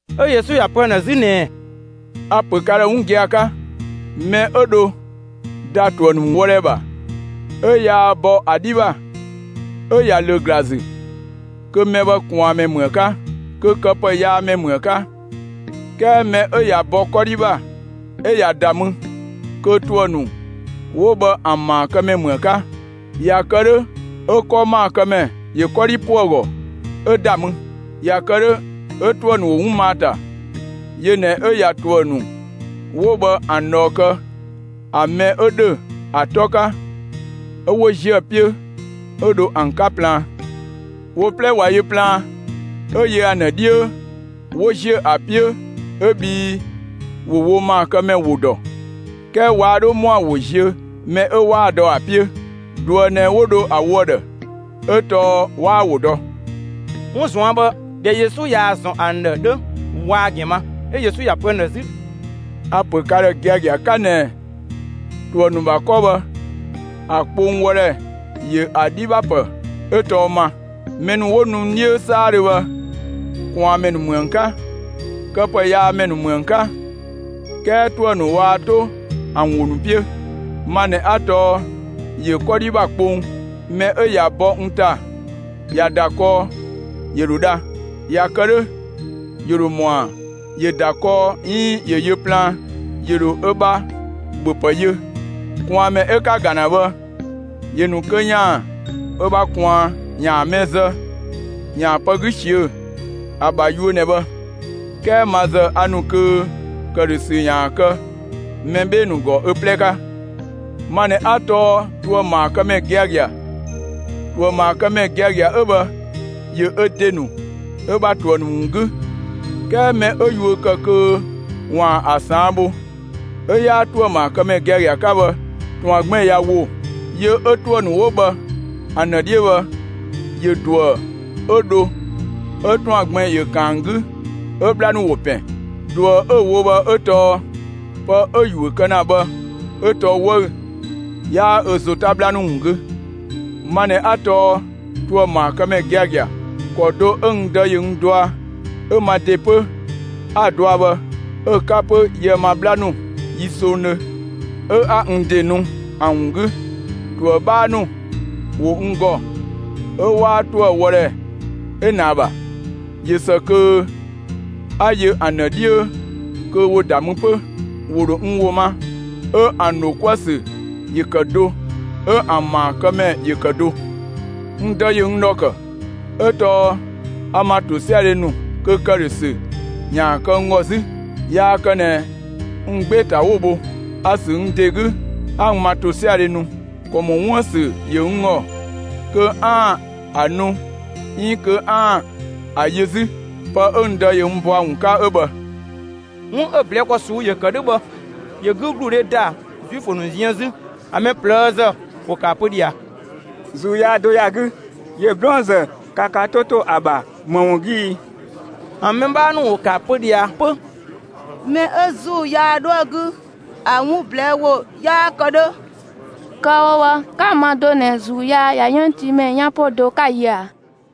'Ö Yesu ‑ya pö ‑an ‑dhë 'zü ꞊nɛɛ: «A‑ ‑pö ka ‑dhë 'wun gia‑ 'ka: Mɛ 'ö dho ‑da ‑tuë ‑nu wɔdhɛ ‑bha, 'ö yaa bɔ ‑a 'dhi ‑bha, 'ö ꞊ya ‑lö ‑gla ‑zü, kö mɛ bhë ꞊kwaanmɛ ‑mü ‑a 'ka, kö këpëyaamɛ ‑mü ‑a 'ka. 'Kɛɛ mɛ 'ö ꞊ya bɔ 'kɔdhi ‑bha 'ö ꞊ya ‑da mü, kö ‑tuë ‑nu 'wo bhë ‑an ‑maakëmɛ ‑mü ‑a 'ka. ꞊Ya kë 'dhö 'ö 'kɔ ‑maakëmɛ ‑yö 'kɔdhi ‑po ‑a ‑gɔ 'ö ‑da mü. ꞊Ya kë 'dhö 'ö ‑tuë ‑nu ‑wo 'wun ma ‑a ‑ta. Yö ꞊nɛ 'ö ꞊ya ‑tuë ‑nu 'wo bhë ‑an ꞊dhɔɔ kë ‑a mɛ 'ö ‑dhö ‑a 'tɔ 'ka, 'ö 'wo ‑ziö ‑a 'piö 'ö dho ‑an 'ka plaan. Wo 'plɛ ꞊wa yö plaan, 'ö yö ‑an ‑dhë 'dhiö, 'wo ‑ziö ‑a 'piö 'ö bhii ‑wo wo ‑maakëmɛ ‑wo ‑dɔ. 'Kɛɛ waa 'dhö ‑mɔa ‑wo ziö mɛ 'ö 'waa‑ dɔ ‑a 'piö. ꞊Duë ꞊nɛ 'wo dho ‑a wo ‑a ‑dhë; 'ö tɔɔ 'waa‑ ‑wo dɔ.» 'Wun ꞊zuan' bhë ꞊dhɛ Yesu ꞊yaa‑ ‑zɔn ‑an ‑dhë 'dhö, waa‑ ‑gɛn ma. 'Ö Yesu ‑ya pö ‑an ‑dhë 'zü: «A‑ ‑pö ka ‑dhë giagia 'ka ꞊nɛ ‑tuë ‑nu ‑bha 'kɔ bhë ‑a kpong wɔdhɛ ‑yö ‑a 'dhi ‑bha ‑pë 'ö tɔɔ ma. Mɛ ‑nu 'wo nu n 'dhiö 'saadhö bhë, ꞊kwaanmɛ ‑nu ‑mü ‑an 'ka; këpëyaamɛ ‑nu ‑mü ‑an 'ka. 'Kɛɛ ‑tuë ‑nu waa 'to ‑an ‑wo ‑nu 'piö. Ma ꞊nɛ 'a tɔɔ ‑yö 'kɔdhi ‑bha kpong. Mɛ 'ö ꞊ya bɔ n ‑ta ꞊ya ‑da kɔɔ, ‑yö ‑dho dha. ꞊Ya kë 'dhö, ‑yö ‑dho ‑mɔa ‑yö ‑da kɔɔ 'iin ‑yö yö plaan; ‑yö ‑dho ö ‑bha ‑bhöpë yö. ꞊Kwaanmɛ 'ö 'ka‑ ‑ga ‑na bhë, ‑yö ‑nu kö ‑yaan ö ‑bha ꞊kwaan, ‑yaan mɛ zë, ‑yaan pë 'gü ꞊siö'‑. ‑A ‑bha yuö ꞊nɛ bhë. 'Kɛɛ ma ‑zë a ‑nu kö ‑këdhösü ‑yaan kë mɛ 'bhee‑ ‑nu ‑gɔ ö 'plɛ 'ka. Ma ꞊nɛ 'a tɔɔ ‑tuëmaakëmɛ giagia. ‑Tuëmaakëmɛ giagia 'ö bhë ‑yö ö ‑de ‑nu ö ‑bha ‑tuë ‑nu ‑wun 'gü. 'Kɛɛ mɛ 'ö yuö ‑kë kö ‑waan ‑a ꞊saan' bho, 'ö 'yaa ‑tuëmaakëmɛ giagia 'ka bhë; ‑tɔan gbɛn‑ ꞊ya ‑wo yö, 'ö ‑tuë ‑nu 'wo bhë ‑an ‑dhë 'dhiö bhë, ‑yö ‑duë 'ö dho 'ö ‑tɔan gbɛn‑ ‑yö kan ‑an 'gü 'ö 'bhla ‑nu ‑wo ‑pɛn. ꞊Duë 'ö‑ wo bhë 'ö tɔɔ pë 'ö‑ ‑yuö kë ‑na bhë 'ö tɔɔ 'wëü‑; 'yaa ö ‑zo 'ta 'bhla ‑nu ‑wun 'gü. Ma ꞊nɛ 'a tɔɔ ‑tuëmaakëmɛ giagia. ‑Kɔ do 'ö n Dë ‑yö n dɔa, 'ö ma ‑de 'pö 'a‑ dɔa bhë 'ö‑ 'ka 'pö yië‑ ma 'bhla ‑nu yi songdhö 'ö 'a n ‑de ‑nu ‑an ‑wun 'gü. ‑Tuë 'bhaa ‑nu ‑wo n ‑gɔ 'ö 'waa ‑tuë wɔdhɛ 'ö ꞊nɛ ‑a ‑bha. ꞊Yö ‑së kö 'a yö ‑an ‑dhë 'dhiö kö ‑wo ‑da mü 'pö. ‑Wo ‑dho n ‑wo ma, 'ö ‑an dho 'kuë‑ ‑sü ‑yö ‑kë do, 'ö ‑an ‑maakëmɛ ‑yö ‑kë do. N Dë ‑yö n ‑dhɔ ‑kë; 'ö tɔɔ a n ‑ma ‑tosiadhe ‑nu kö ‑këdhösü ‑yaan kë n ‑gɔ 'zü. Yaa kë ꞊nɛ n 'gbee‑ ‑ta 'wo‑ bho. A‑ ‑sü n ‑de 'gü 'a n ‑ma ‑tosiadhe nu. ‑Kɔ ‑mɔ 'wuën‑ ‑sü ‑yö n ‑gɔ kö 'aan‑ ‑a nu 'iin kö 'aan‑ ‑a yö 'zü. Pë 'ö n Dë ‑yö n bɔ ‑a ‑wun 'ka 'ö bhë.» 'Wun 'ö‑ ꞊blɛɛ' ‑kɔ ꞊suu'‑ ‑yö ‑kë 'dhö bhë, ‑yö 'gügludhe ‑da Zuifö ‑nu ziën 'zü. ‑An mɛ ꞊plëëzë ‑wo ‑kë ‑a pö ꞊dhia: «‑Zuu yaa do ‑ya 'gü! ‑Yö 'blɔɔnzë! Ka ka 'to ‑to ‑a ‑bha ‑më ‑wun 'gü ii?» ‑An mɛ 'bhaa ‑nu ‑wo ‑kë ‑a pö ꞊dhia 'pö: «Mɛ 'ö ‑zuu yaa 'dhoë‑ 'gü, ‑a 'wun ꞊blɛɛ' ‑wo yaa kë ‑dhö. Kë‑ wo bhë, 'ka‑ ma do ꞊nɛ ‑zuu yaa ꞊ya 'yënngtiimɛ 'yan 'po do 'ka‑ yö ꞊a?»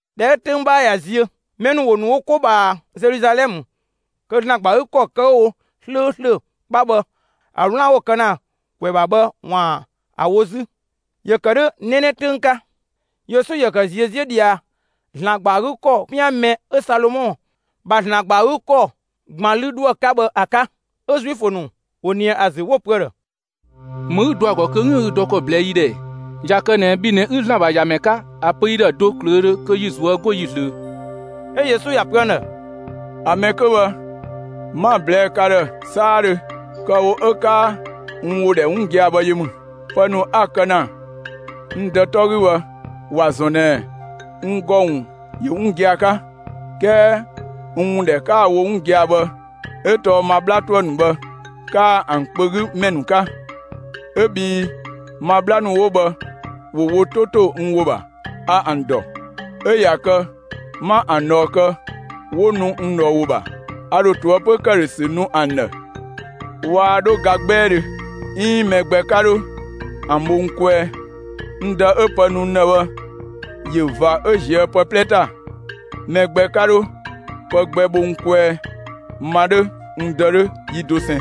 (꞊Dhɛ 'ö 'töng 'bhaa ꞊ya ziö,) mɛ ‑nu ‑wo ‑nu wo 'ko ꞊bhaa Zeluzalɛmë kö ‑Zlan ‑gba ‑a 'gü ‑kɔ kë 'wo‑ wo 'slööslö 'kpa bhë ‑a 'wlaan‑ 'wo‑ kë ‑na ‑kwɛ ‑bha bhë, ‑waan ‑a wo 'zü. ‑Yö ‑kë 'dhö 'nɛnɛ 'töng 'ka. Yesu ‑yö ‑kë ꞊ziö' 'ziö ꞊dhia ‑Zlan ‑gba ‑a 'gü ‑kɔ 'pian mɛ 'ö Salomɔ ‑bha ‑Zlan ‑gba ‑a 'gü ‑kɔ ‑gban 'lü 'dhoë‑ 'ka bhë ‑a 'ka. 'Ö Zuifö ‑nu ‑wo ꞊nië ‑a ‑zü, 'wo‑ pö ‑a ‑dhë: «‑Më 'ü dɔ ‑a ‑gɔ kö 'üën‑ ü dɔ ‑kɔ ꞊blɛɛ' yi ‑dhë ɛɛ? ꞊Ya kë ꞊nɛ bhi ꞊nɛ 'ü ‑Zlan ‑bha ‑Yamɛ 'ka, ‑a pö yi ‑dhë do ꞊klöödhö kö yi ꞊zuö' 'go yi ꞊zlöö.» 'Ö Yesu ‑ya pö ‑an ‑dhë: «‑A mɛ 'kö bhë, 'ma‑ ꞊blɛɛ' ka ‑dhë 'saadhö; kë‑ wo 'ö 'kaa n ‑wo ‑dhɛ 'wun gia‑ bhë yö ‑mü. Pë ‑nu 'a‑ kë ‑na n Dë 'tɔ 'gü bhë ‑wa ‑zɔn ꞊nɛ n ‑gɔ ‑wun ‑yö 'wun gia‑ 'ka. 'Kɛɛ n ‑wun ‑dhɛ 'kaa‑ wo ‑na 'wun gia‑ bhë 'ö tɔɔ ma 'bhla ‑tuë ‑nu bhë 'kaa ‑an kpö 'gü ‑mɛ ‑nu 'ka. 'Ö bhii ma 'bhla ‑nu 'wo bhë ‑wo wo 'to ‑to n ‑wo ‑bha. A ‑an ‑dɔ, 'ö ꞊ya kë 'ma ‑an ꞊dhɔɔ kë, 'wo nu n ꞊dhɔɔ ‑wo ‑bha. A ‑dho ꞊toëpö ‑këdhösü nu ‑an ‑dhë; waa 'dho ga 'gbɛɛdhö, 'iin 'ö mɛ gbɛ 'ka 'dho ‑an bho n kwɛɛ. N Dë 'ö pë nu n ‑dhë bhë ‑yö ꞊va 'ö ‑ziö pë 'plɛ ‑ta. Mɛ gbɛ 'ka 'dho pë gbɛ bho ‑a kwɛɛ. Ma 'dhö, n Dë 'dhö, yi dosɛn.»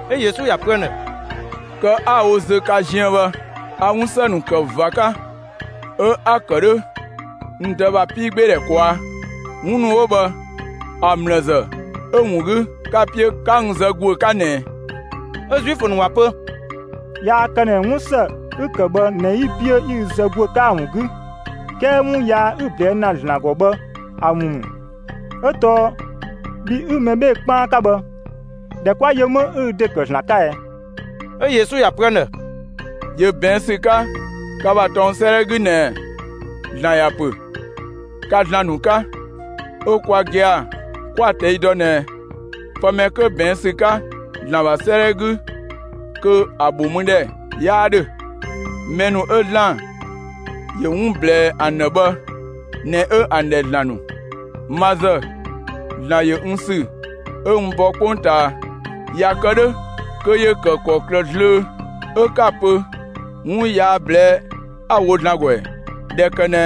'Ö Yesu ‑ya pö ‑an ‑dhë: «Kë 'a‑ wo zö ka ziën bhë, a 'wunsë ‑nu ‑kë ꞊va 'ka; 'ö 'a‑ ‑kë 'dhö n Dë ‑bha 'piigbeedhɛ ꞊kwaa'. 'Wun ‑nu 'wo bhë ‑a ‑mlë ‑zë 'ö‑ ‑wun 'gü 'ka‑ 'piö 'ka n zë ‑guö 'ka ꞊nɛɛ?» 'Ö Zuifö ‑nu ‑wa pö: «Yaa kë ꞊nɛ 'wun ‑së 'ü‑ ‑kë bhë ꞊nɛ 'yi‑ 'piö 'yi ü zë ‑guö 'ka ‑a ‑wun 'gü; 'kɛɛ 'wun yaa 'ü‑ ꞊blɛɛ' ‑na ‑Zlan ‑gɔ bhë ‑a ‑wun ‑mü. 'Ö tɔɔ bhi 'ü mɛ 'bhee‑ 'kpaan 'ka bhë, ‑dhɛ 'kwa yö 'më 'ü ü ‑de ‑kë ‑Zlan 'ka ɛɛ?» 'Ö Yesu ‑ya pö ‑an ‑dhë: «‑Yö ꞊bɛɛn' ‑sü 'ka ka ‑bha tɔng 'sëëdhɛ 'gü ꞊nɛɛ: ‑Zlan ‑ya ‑pö: Ka ‑zlan ‑nu 'ka. 'Ö kwa gia‑ 'kwa‑ ꞊tɛi' dɔ ꞊nɛ pë mɛ 'kö ꞊bɛɛn' ‑sü 'ka ‑Zlan ‑bha 'sëëdhɛ 'gü kö ‑a ‑bho mü ‑dhɛ 'yaa 'dhö. Mɛ ‑nu 'ö ‑Zlan ‑yö 'wun ‑blɛɛ ‑an ‑dhë bhë ꞊nɛ 'ö ‑an ‑dhɛ ‑zlan ‑nu. Ma ‑zë, ‑Zlan ‑yö n ‑sü 'ö n bɔ 'kpongtaa. ꞊Ya kë 'dhö kö ‑yö ‑kë ‑kɔklë zlöö 'ö 'ka‑ pö 'wun yaa ꞊blɛɛ'‑ 'a‑ wo ‑Zlan ‑gɔ ‑ɛ, ꞊dhɛ kë ꞊nɛ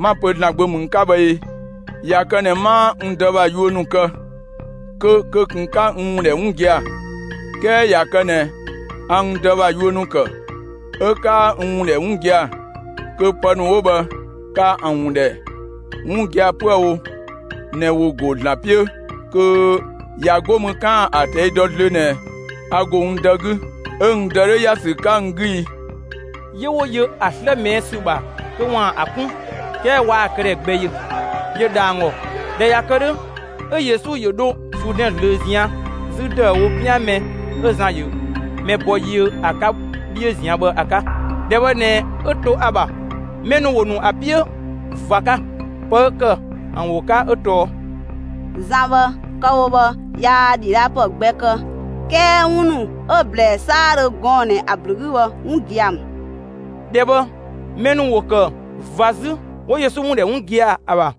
'ma‑ pö ‑Zlan Gbö ‑mü n 'ka bhë ee? ꞊Ya kë ꞊nɛ 'maa n Dë ‑bha yuö ‑nu kë, kö kö ꞊kun 'ka n ‑wun ‑dhɛ 'wun gia‑. 'Kɛɛ ꞊ya kë ꞊nɛ a n Dë ‑bha yuö ‑nu ‑kë, 'ö 'kaa n ‑wun ‑dhɛ 'wun gia‑; kö pë ‑nu 'wo bhë ka ‑an ‑wun ‑dhɛ 'wun gia‑ 'püë‑ wo ꞊nɛ ‑wo ‑go ‑Zlan 'piö kö ꞊ya 'go mü 'kaan‑ ‑a ꞊tɛi' dɔ zlöö ꞊nɛ a ‑go n Dë 'gü, 'ö n Dë 'dhö ‑ya ‑sü 'ka n 'gü i.» 'Yö 'wo yö ‑a 'slë ꞊mɛɛ' ‑sü ‑bha kö ‑waan ‑a 'kun, 'kɛɛ waa‑ këdhɛ gbɛ yö. ‑Yö ‑dha ‑an ‑gɔ. ꞊Dhɛ ꞊ya kë 'dhö, 'ö Yesu ‑yö dho Zuudɛn zlöö ꞊zian' 'zü ‑dëüwo, 'pian mɛ 'ö Zan ‑yö mɛ bɔ yiö ‑a 'ka 'dhiö ꞊zian' bhë ‑a 'ka; ‑dhɛ bhë ꞊nɛ 'ö to ‑a ‑bha. Mɛ ‑nu ‑wo ‑nu ‑a 'piö ꞊va 'ka. Pë 'ö ‑kë ‑an ‑wo 'ka 'ö tɔɔ: «Zan bhë kë‑ wo bhë, yaa ‑dhidhaapë gbɛ kë; 'kɛɛ 'wun ‑nu 'ö‑ ꞊blɛɛ 'saadhö gɔɔn‑ ꞊nɛ ‑a ‑blü 'gü bhë 'wun gia‑ ‑mü.» ‑Dhɛ bhë mɛ ‑nu ‑wo ‑kë ꞊va 'zü, 'wo Yesu ‑wun ‑dhɛ 'wun gia‑ ‑a ‑bha.